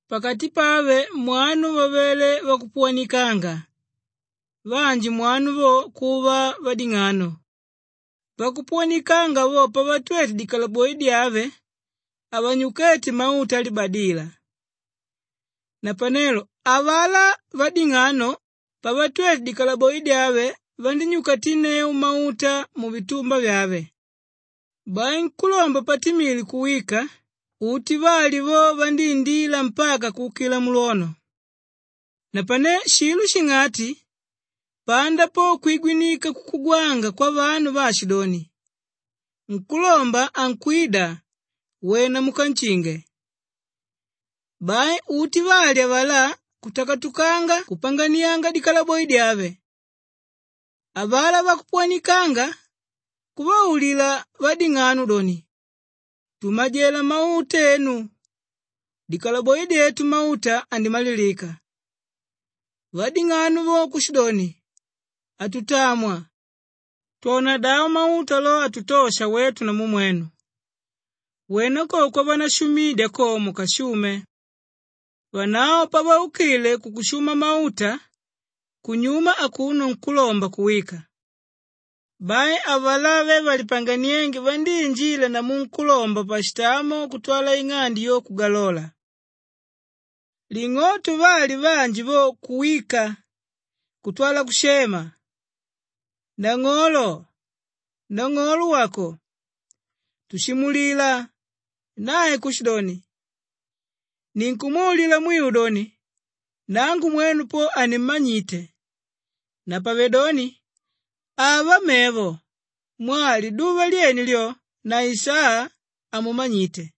Pakati pave mwanu vavele vakupuwanikanga, vanji mwanu vo kuva vading'ano. Vakupuwanikanga vo pavatwete dikalaboi dyave, havanyukéte mauta alibadila. Napanelo avalá vading'ano, pavatwete dikalaboi dyave vandínyukatinneu mauta muvitumba vyave. Bai nkúlomba patimile kuwika, uti vali vo vandíindila mpaka kuukila mulwono. Napane shilo shing'ati panda po kwigwinika kukugwanga kwavanu vaashidoni, ‘Nkúlomba ankwida, wena munkanshinge.’ Bai uti vali avalá kutakatukanga kupanganianga dikalaboi dyave. Avalá vakupuwanikanga kuvaulila vading'ano doni, ‘Tumajela mauta enu dikalaboi dyetu mauta andimalilika!’ Vading'ano vo kushidoni, ‘Hatutamwa! Twonadavo mauto lo, hatutosha wetu namu mwenu. Wena ko kwavanashumidya ko, mukashume.’ Vanavo pavaukile kukushuma mauta, kunyuma akuno nkúlomba kuwika. Bai avalá ve valipanganiénge vandíinjila namu nkúlomba pashitamo kutwala ing'ande yo kugalola. Ling'oto, vali vanji vo kuwika kutwala kushema, ‘Nang'olo, nang'olo wako, tushimulila!’ Nae kushidoni, ‘Ninkumwaulila mwiu doni, nangu mwenu po hanimmanyite.’ Napavedoni ava mevo mwaa liduva lyene lyo na isaa, hamumanyite.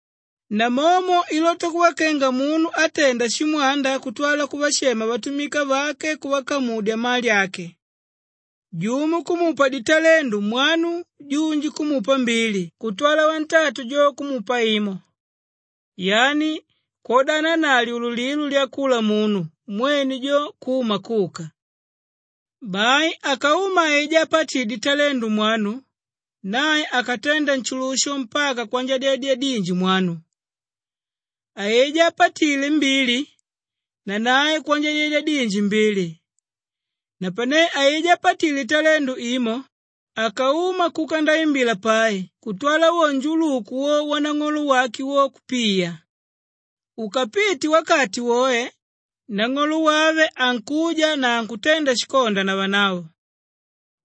“Namomo ilota kuva kenga munu átenda shimwanda kutwala kuvashema vatumika vake kuvakamudya mali ake. Jumo kumupa ditalendu mwanu, junji kumupa mbili kutwala wantatu jo kumupa imo, yani kwodana na lyululilo lyakula munu mwene jo kuma kuka. Bai akauma aijá ápatile ditalendu mwanu, nae akatenda nshulusho mpaka kwanjadyedya dinji mwanu. Aijá ápatile mbili, nanae kwanjadyedya dinji mbili. Napane aijá ápatile italendu imo, akauma kuka ndaimbila pai kutwala wo njuluku wo wanang'olo wake wo, kupiya. “Ukapite wakati woe, nang'olo wave ankuja na ankutenda shikonda na vanavo.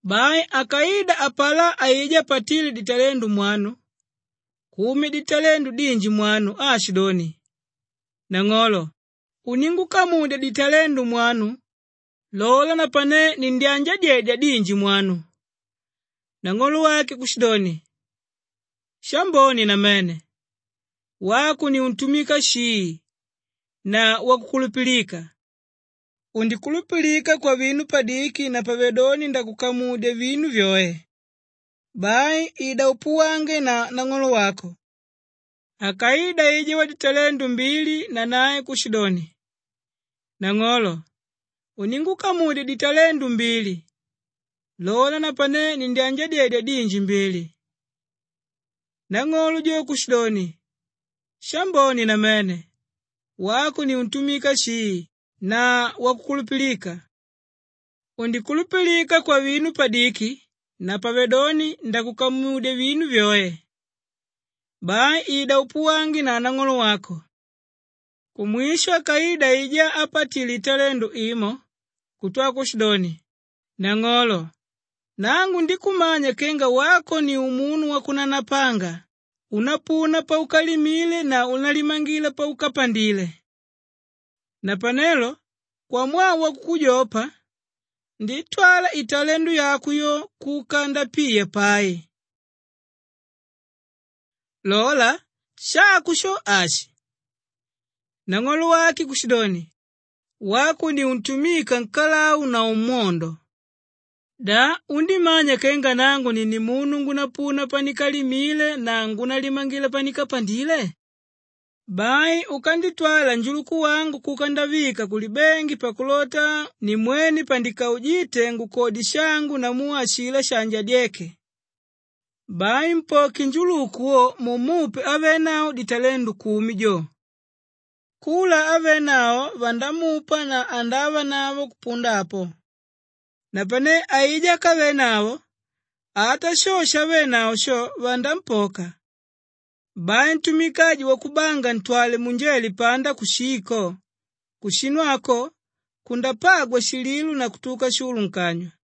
Bai akaida apalá aijá ápatile ditalendu mwanu, kumya ditalendu dinji mwanu aashidoni, ‘Nang'olo, uníngukamudya ditalendu mwanu. Lola napane nindyanjadyedya dinji mwanu.’ Nang'olo wake kushidoni, ‘Shambone namene! Wako ni untumika shii na wakukulupilika! Undikulupilika kwavinu padiki napavedoni ndakukamudya vinu vyoe. Bai ida upuwange na nang'olo wako.’ Akaida aijá waditalendu mbili nanae kushidoni, ‘Nang'olo, uníngukamudya ditalendu mbili. Lola napane nindyanjadyedya dinji mbili.’ Nang'olo jo kushidoni, ‘Shambone namene! Wako ni untumika shii na wakukulupilika. Undikulupilika kwavinu padiki napavedoni ndakukamudya vinu vyoe. Bai ida upuwange na nang'olo wako.’ “Kumwisho akaida aijá ápatile italendu imo kutwala kushidoni, ‘Nang'olo, nangu ndíkumanya kenga wako ni umunu wakunanapanga, únapuna paukalimile na únalimangila paukapandile. Napanelo kwamwaa wakukujopa, ndítwala italendu yako yo kuka ndapiya pai. Lola, shako sho, ashi.’ Nang'olo wake kushidoni, ‘Wako ni untumika nkalau na umwondo! Da undímanya kenga nangu ni nimunu ngúnapuna pandikalimile na ngúnalimangila pandikapandile? Bai ukanditwala njuluku wangu kuka ndavika kulibengi pakulota nimwene pandikaujite ngukodye shangu namu ashilá shaanjadyeke. Bai mpoke njuluku wo mumupe ávenavo ditalendu kumi jo. Kula ávenavo vandamupa na andavanavo kupunda apo. Napane aijá ákavenavo, ata sho shavenavo sho, vanampoka. Bai ntumika aju wakubanga ntwale munjele panda kushii ko! Kushinu ako kundapagwa shililo na kutuka shulu nkanywa.’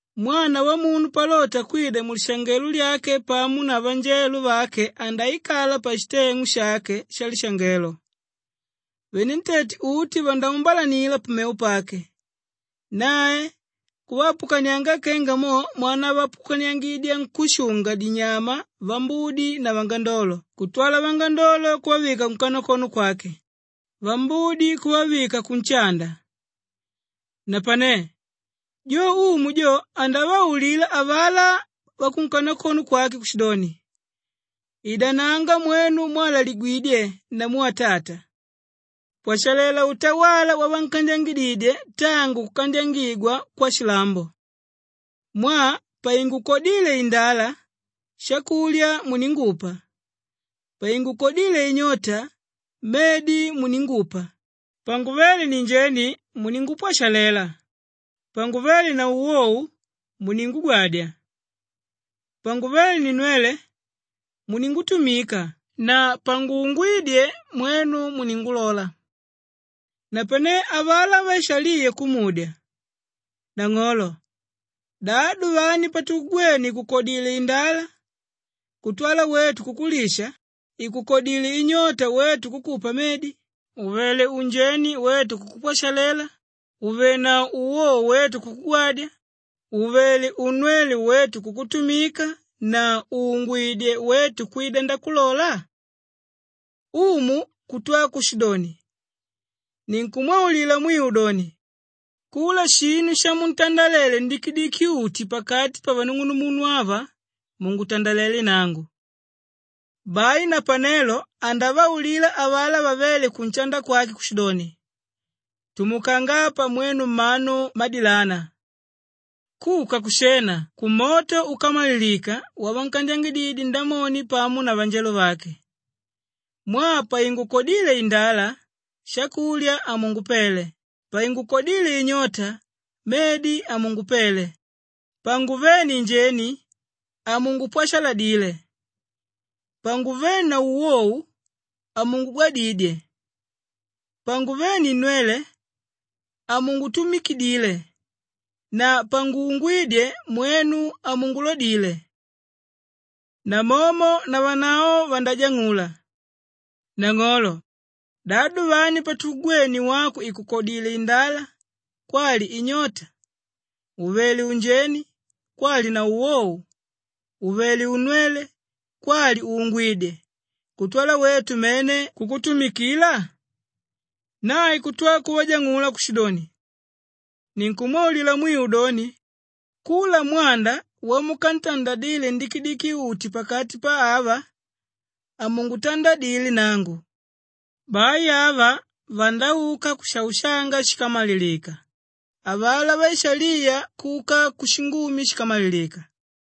“Mwana Wamunu palota kwida mulishangelo lyake pamo na vanjelo vake andaikala pashiteng'u shake shalishangelo. Venentete uti vandaumbalanila pamevo pake, nae kuvaapukanianga kenga mo mwanavaapukaniangidya nkúshunga-dinyama vambudi na vangandolo kutwala vangandolo kuvavika kunkanakono kwake, vambudi kuvavika kunshanda. Napane jo Umu jo andavaulila avalá vakunkanakono kwake kushidoni, ‘Idananga mwenu mwalaligwe namu atata! Pwashalela utawala wavankandyangididye tangu kukandyangigwa kwashilambo. Mwaa paingukodíle indala shakulya muningupa, paingukodíle inyota medi muningupa, panguvéle ninjeni muningupwashalela, panguvé na uwou muningugwadya, panguvé ninnwele muningutumika na panguungwídye, mwenu muningulola!’ “Napanelo avalá vaishaliya kumudya, ‘Nang'olo, da duvani patukugwene ìkukodile indala kutwala wetu kukulisha, ìkukodile inyota wetu kukupa medi, ùvele unjeni wetu kukupwashalela, ùvenavo uwou wetu kukugwadya, ùvele unnwele wetu kukutumika na ùungwidye, wetu kwida ndakulola?’ Umu kutwa kushidoni, ‘Ninkumwaulila mwiu doni, kula shinu shamuntandalele ndikidiki-uti pakati pavanung'uvangu ava, mungutandalelé nangu.’ “Bai napanelo andavaulila avalá vavé kunshanda kwake kushidoni, ‘Tumukanga apa mwenu mmanu mmadilana! Kuka kushena, kumoto úkamalilika wavankandyangididye Ndamoni pamo na vanjelo vake. Mwaa paingukodíle indala shakulya hamungupele, paingukodíle inyota medi hamungupele, panguvé ninjeni hamungupwashaladile, panguvé na uwou hamungugwadidye, panguvé ninnwele hamungutumikidile na panguungwídye, mwenu hamungulodile!’ Namomo navanavo vandajang'ula, ‘Nang'olo, da duvani patukugwene wako ìkukodile indala kwali inyota, ùvele unjeni kwali na uwou, ùvele unnwele kwali ùungwidye kutwala wetu mene kukutumikila?’ Nae kutwa kuvajang'ula kushidoni, ‘Ninkumwaulila mwiu doni, kula mwanda wamukantandadile ndikidiki-uti pakati pa ava, hamungutandadile nangu.’ Bai ava vandauka kushaushanga shíkamalilika, avalá vaishaliya kuka kushingumi shíkamalilika.”